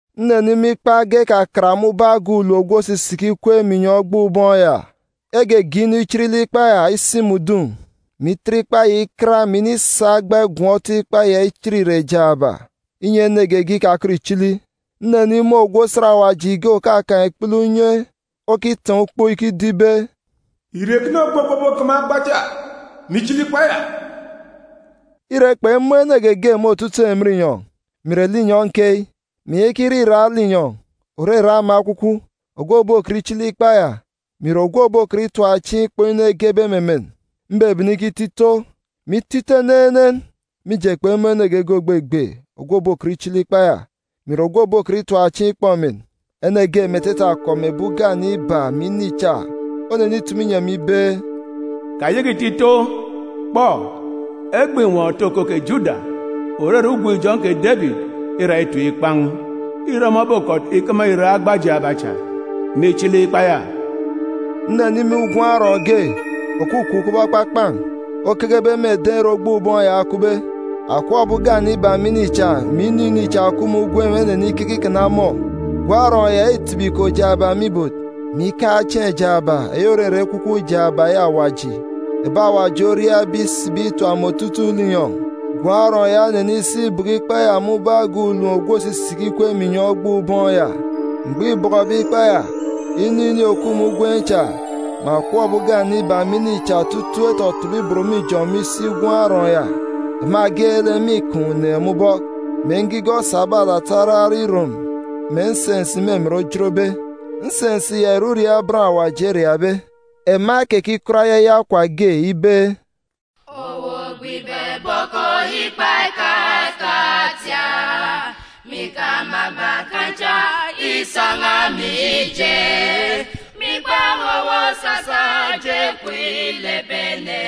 Nnenimun̄ ikpa ekakat ge me ubọk agan̄ ulom ogwu òsisiki ikweek me inyọn̄ ogboon̄ ubọọn̄ ya. Egege inu ichit lek ikpa ya, isi mè udun̄, mè itet ikpa ya ikat, mè inisa agba igọm ikpa ya ichit irek jaaba, inyi ene geege ikakọt ìchili. Nnenimun̄ ogwu osat Awaji ge òkakaan̄ ikpele unye okitaan̄ ukpo ikido ibe, “Ìre ekene ogbe ogwu òbokama agba cha, mè ichili ikpa ya?” Ire, kpemun̄ ene geege me otutuuk emen inyọn̄, mè ìre linyọn̄ keyi, mè ìyaka ire irak linyọn̄, òrere ama ekwukwu, ogwu òbokọt ichili ikpa ya, mè ìre ogwu òbokọt itap chieen̄ ikpọ inu egebe me emen. Mbebene ikito ito, mè ito ito enenen, mije, kpemun̄ ene geege ògbegbe, ogwu òbokọt ichili ikpa ya, mè ìre ogwu òbokọt itap chieen̄ ikpọ emen. Ene ge me etete akọp ebi ugane iba mè ini cha onenitumu inyi emi ibe, “Kayaka ìto ito! Kpọ, Egbe Àtat otoko kè Juda, òrere Ugwun̄-ijọn̄ kè Debit îra itim ikpan̄. Îre ọmọ obokọt ikama irek agba jaaba cha, mè ichili ikpa ya.” Nnenimun̄ Gwun̄ Arọọn̄ ge, òkukup kubọk ekpakpan̄, okekebe me eden̄ ere ogboon̄ ubọọn̄ ya okupbe. Akọp ebi ugane iba mè ini cha, mè inu ini cha òkup me ugwem enenikeke ikana ọmọ. Gwun̄ Arọọn̄ ya îtibi iko jaaba me ibot, mè ikaan̄ chieen̄ jaaba, eyi òrere ekwukwu jaaba eyi Awaji, ebi Awaji oriabe isibi itap me otutuuk linyọn̄. Gwun̄ Arọọn̄ ya onenisi ibọkọ ikpa ya me ubọk agan̄ ulom ogwu òsisiki ikweek me inyọn̄ ogboon̄ ubọọn̄ ya. Mgbọ îbọkọbe ikpa ya, inu ini òkup me ugwem cha, mè akọp ebi ugane iba mè ini cha otutuuk etọtọbọ ibot me ijọn̄ me isi Gwun̄ Arọọn̄ ya. Ema geelek mîkaan̄ uneen̄ me ubọk, mè ngigọ esabe alata araran̄ irom, mè nsensi me emen ojotbe. Nsensi ya ìre uriaak bọn Awaji eriaakbe. Ema ekekikọt ayaya okwa ge ibe, “Owu ogbe ibọbọkọ ikpa ekakat ya, mè ikama agba kan̄ cha isan̄a, mije, mîkpan̄ owu, owu osasa eje kwun̄ ilep ebi ene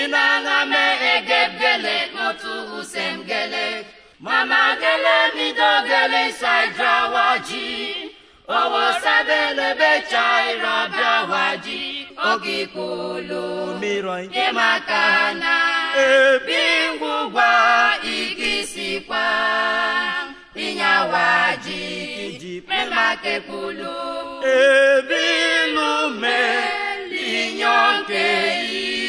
inan̄a me egep geelek, mè otu usem geelek, mè ama geelek, mè ido geelek, isa ijet Awaji. Owu osa ebi olepbe cha irọ ebi Awaji okikpulu, mè irọ inyi ema ekana ebi ngwugwa ìkisi ikwaan̄ inyi Awaji kiji, mè ema ekekpulu ebi ìluk me linyọn̄ keyi.”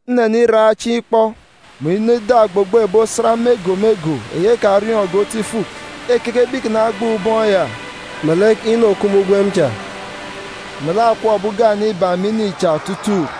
Nneniraan̄ chieen̄ ikpọ, mè inọ ida ogbogbo ebi osat me ego me ego, ekariọọn̄ge otu ifuk, ekekebe ikana ogboon̄ ubọọn̄ ya, melek inu òkup me ugwem cha, melek akọp ebi ugane iba mè ini cha otutuuk,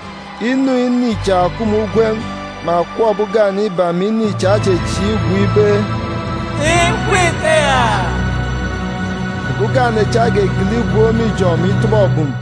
Inu ini cha òkup me ugwem, mè akọp ebi ugane iba mè ini cha echechieek igwook ibe, “Ikup ikeya!” Ebi ugane cha egegele igwook me ijọn̄, mè itọbọ ebum.